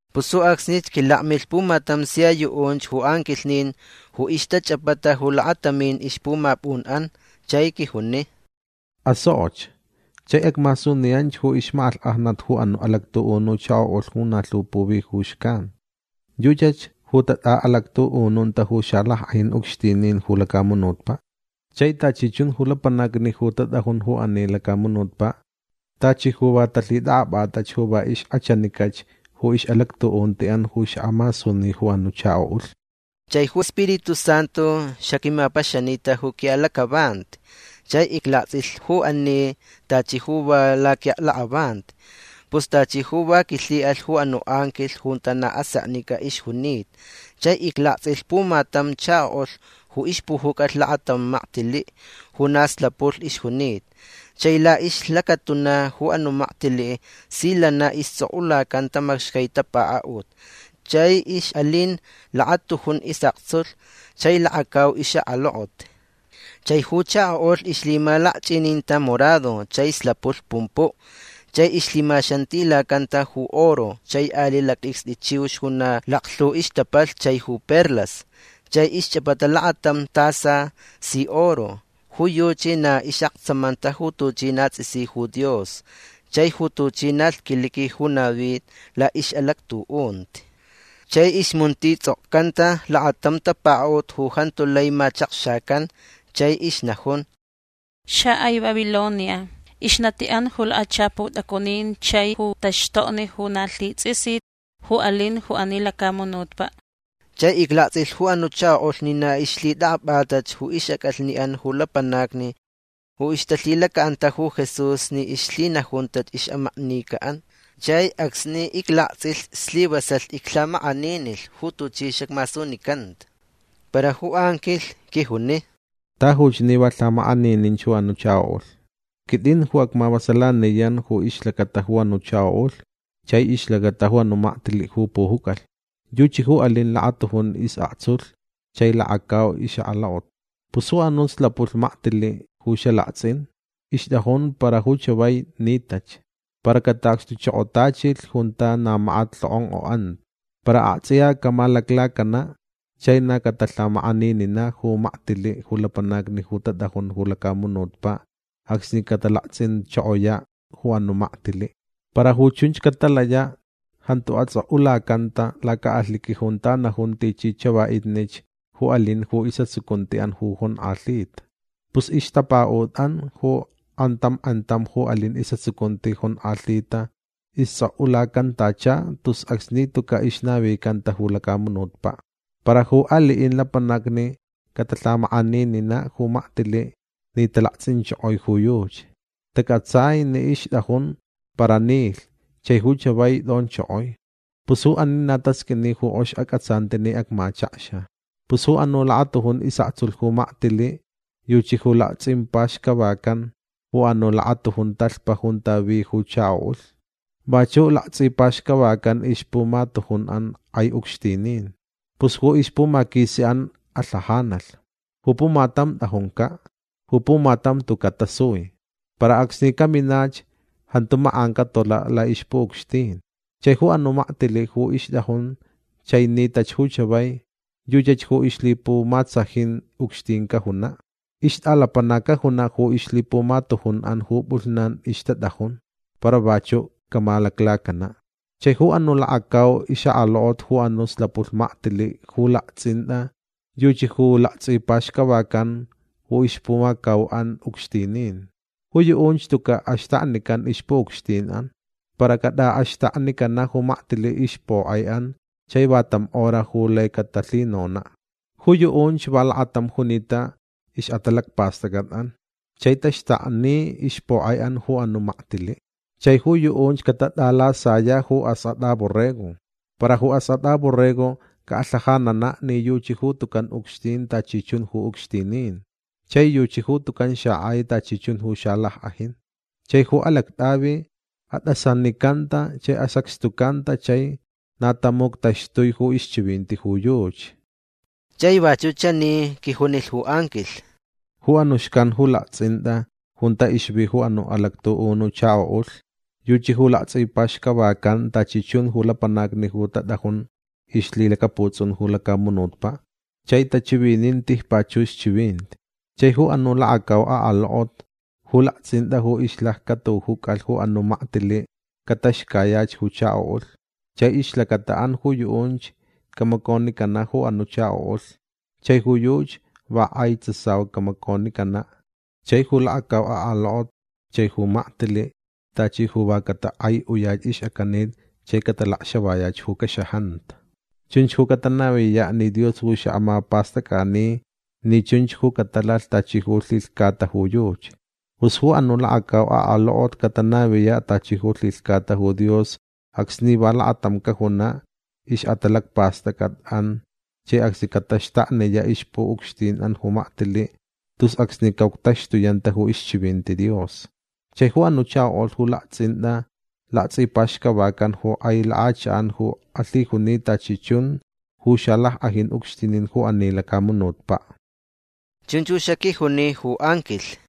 Pus ju acsnich quilakmilh pumatam sia yuʼunch ju anquilhnin ju ixtachʼapata ju lakatamin ixpumapʼunʼan. Chai quijuni: ―Asokʼoch. Chai acmasuniyanch ju ixmakʼalhkʼajnat ju anuʼ alactuʼunu chakoʼulh ju na lhu puvi ju xcan. Yuchach ju tatʼaʼalactuʼununta ju xalackʼajin ucxtinin ju lacamunutpaʼ. Chai tachi chun ju lapanacni ju tatʼajun ju ani lacamunutpaʼ tachi ju va talhitʼakʼapʼatach ju va ixkʼachanicach ju ixʼalactuʼuntiʼan ju xaʼamasuni ju anuʼ chakoʼulh. Chai ju Spiritu Santu xaquimapaxanita ju quiʼalacʼavanti chai iclaktsʼilh ju ani tachi ju va laquiʼaklakʼavanti. Pus tachi ju va quilhiʼalh ju anuʼ anquilh junta na aseknicʼa ixjunita. Chai iclaktsʼilh pumatam chakoʼulh ju ixpujucʼalh lakatam maktiliʼ ju na slapulh ixjunita. Chai laʼixlacatuna ju anuʼ maktiliʼ si lana istsʼokʼulacanta macxcai tapakaʼut. Chai ixʼalin lakatujun isʼaktsulh chai lakacau ixʼakalokot. Chai ju chakoʼulh ixlhimalakchʼininta morado chai slapulh pumpuʼ. Chai ixlhimaxantilacanta ju oro chai aliʼ lactʼicstʼi chiux ju na laklhu ixtapalh chai ju perlas. Chai ixchʼapata lakatam tasa si oro. Ju yuchi na ixʼaktsamanta ju tuchi na tsʼisi ju Dios chai ju tuchi na lhquiliqui ju navi laʼixʼalactuʼunti. Chai ixmuntitsʼokcanta lakatam tapakaʼut ju jantu lai machakxacan. Chai ixnajun: “Xakʼai Babilonia. Ixnatiʼan ju lakachapu tʼacunin chai ju taxtokni ju na lhitsʼisit ju alin ju ani lacamunutpaʼ”. Chai iclaktsʼilh ju anuʼ chakoʼulh ni na ixlhitʼakʼapʼatach ju ixʼacʼalhniʼan ju lapanacni ju ixtalhilacaʼanta ju Jesús ni ixlhinajuntach ixʼamaknica. Chai acsni iclaktsʼilh slivasalh iclhamakʼaninilh ju tuchi xacmasunicanta. Para ju anquilh quijuni: ―Tajuch ni va lhamakʼanininch ju anuʼ chakoʼulh. Quitʼin ju acmavasalaniyan ju ixlacata ju anuʼ chakoʼulh chai ixlacata ju anuʼ maktiliʼ ju pujucʼalh. Yuchi ju alin lakatujun isʼaktsulh chai lakacau ixʼakalokot. Pus ju anuʼ slapulh maktiliʼ ju xalaktsʼin ixtʼajun para ju chavai nitach. Para cataʼacxtuchokotachilh junta na makat lhokʼonkʼoʼanta. Para aktsʼiya camaclacanaʼ. Chai na catalhamakʼanininaʼ ju maktʼiliʼ ju lapanacni ju tatʼajun ju lacamunutpaʼ acsni catalaktsʼinchokoyaʼ ju anuʼ maktiliʼ. Para ju chunch catalayaʼ jantu atsʼokʼulacanta lacaʼalhiqui junta najun tichi chavaʼitnich ju alin ju isʼatsucuntiʼan ju jonkʼalhita. Pus ixtapakaʼutʼan ju kʼantam kʼantam ju alin isʼatsucunti jonkʼalhita istsʼokʼulacantacha tus acsni tucaʼ ixnavicanta ju lacamunutpaʼ. Para ju aliʼin lapanacni catalhamakʼanininaʼ ju maktiliʼ ni talaktsʼinchokoi ju yuchi. Tacʼatsai ni ixtʼajun para nilh chai ju chavai tʼonchokoi. Pus ju ani na tasqʼuini ju kʼox acʼatsanti ni acmachakxa. Pus ju anuʼ lakatujun isʼaktsulh ju maktiliʼ yuchi ju laktsʼipaxcavacan ju anuʼ lakatujun talhpa junta vi ju chakoʼulh. Vachuʼ laktsʼipaxcavacan ixpumatujunʼan kʼai ucxtinin. Pus ju ixpumaquisiʼan alhajacalh. Ju pumatam tʼajuncaʼ. Ju pumatam tucaʼ tasui. Para acsni caminach jantu makʼan catolaʼ laʼixpuʼucxtin. Chai ju anuʼ maktiliʼ ju ixtʼajun chai nitach ju chavai yuchach ju ixlhipumatsajin ucxtin cajunaʼ. Ixtʼalapanac cajunaʼ ju ixlhipumatujunʼan ju pʼulhnan ixtatʼajun. Para vachuʼ camaclacanaʼ. Chai ju anuʼ lakacau ixʼakalokot ju anuʼ slapulh maktiliʼ ju laktsʼintʼa yuchi laktsʼipaxcavacan ju ixpumacauʼan ucxtinin. Ju yuʼunch tucaʼ axtaknican ixpuʼucxtinʼan. Para catʼaʼaxtaknicanaʼ ju maktiliʼ ixpokʼaiʼan chai va tam hora ju lai catalhinonaʼ. Ju yuʼunch va lakatam junita ixʼatalacpastʼacʼatʼan. Chai taxtakni ixpokʼaiʼan ju anuʼ maktiliʼ. Chai ju yuʼunch catatʼalasayaʼ ju Askʼatʼa Borrego. Para ju Askʼatʼa Borrego calhajananaʼ ni yuchi ju tucan ucxtin tachi chun ju ucxtinin. Chai yuchi ju tucan xakʼai tachi chun ju xalackʼajin. Chai ju alactʼavi atʼasanicanta chai asacxtucanta chai na tamuctaxtui ju ixchivinti ju yuchi. Chai vachuʼ chani quijunilh ju anquilh: ―Ju anuʼ xcan ju laktsʼintʼa junta ixvi ju anuʼ alactuʼunu chakoʼulh yuchi laktsʼipaxcavacan tachi chun ju lapanacni ju tatʼajun ixlhilacaputsʼun ju lacamunutpaʼ chai tachivinin tijpachux chivinti. Chai ju anuʼ lakacau akalokot ju laktsʼintʼa ju ixlaccʼatujucalh ju anuʼ maktiliʼ cataxcayach ju chakoʼulh. Chai ixlacataʼan ju yuʼunch camaconicanaʼ ju anuʼ chakoʼulh. Chai ju yuchi va kʼai tsasau camaconicanaʼ. Chai ju lakacau akalokot chai ju maktiliʼ tachi ju va catakʼaiʼuyach ixʼacanit chai catalacxavayach ju caxajanta. Chunch ju catanaviyaʼ ni Dios ju xaʼamapastʼacʼani ni chunch ju catalalh tachi ju lhilhcata ju yuchi. Pus ju anuʼ lakacau akalokot catanaviyaʼ tachi ju lhilhcata ju Dios acsni va lakatam cajunaʼ ixʼatalacpastʼacʼatʼan chai acsni cataxtakniyaʼ ixpuʼucxtinʼan ju maktiliʼ tus acsni caʼuctaxtuyanta ju ixchivinti Dios. Chai ju anuʼ chakoʼulh ju laktsʼintʼa laktsʼipaxcavacan ju kʼai lakʼachakʼan ju alhijuni tachi chun ju xalackʼajin ucxtinin ju ani lacamunutpaʼ. ―Chunch ju xaquijuni ju anquilh.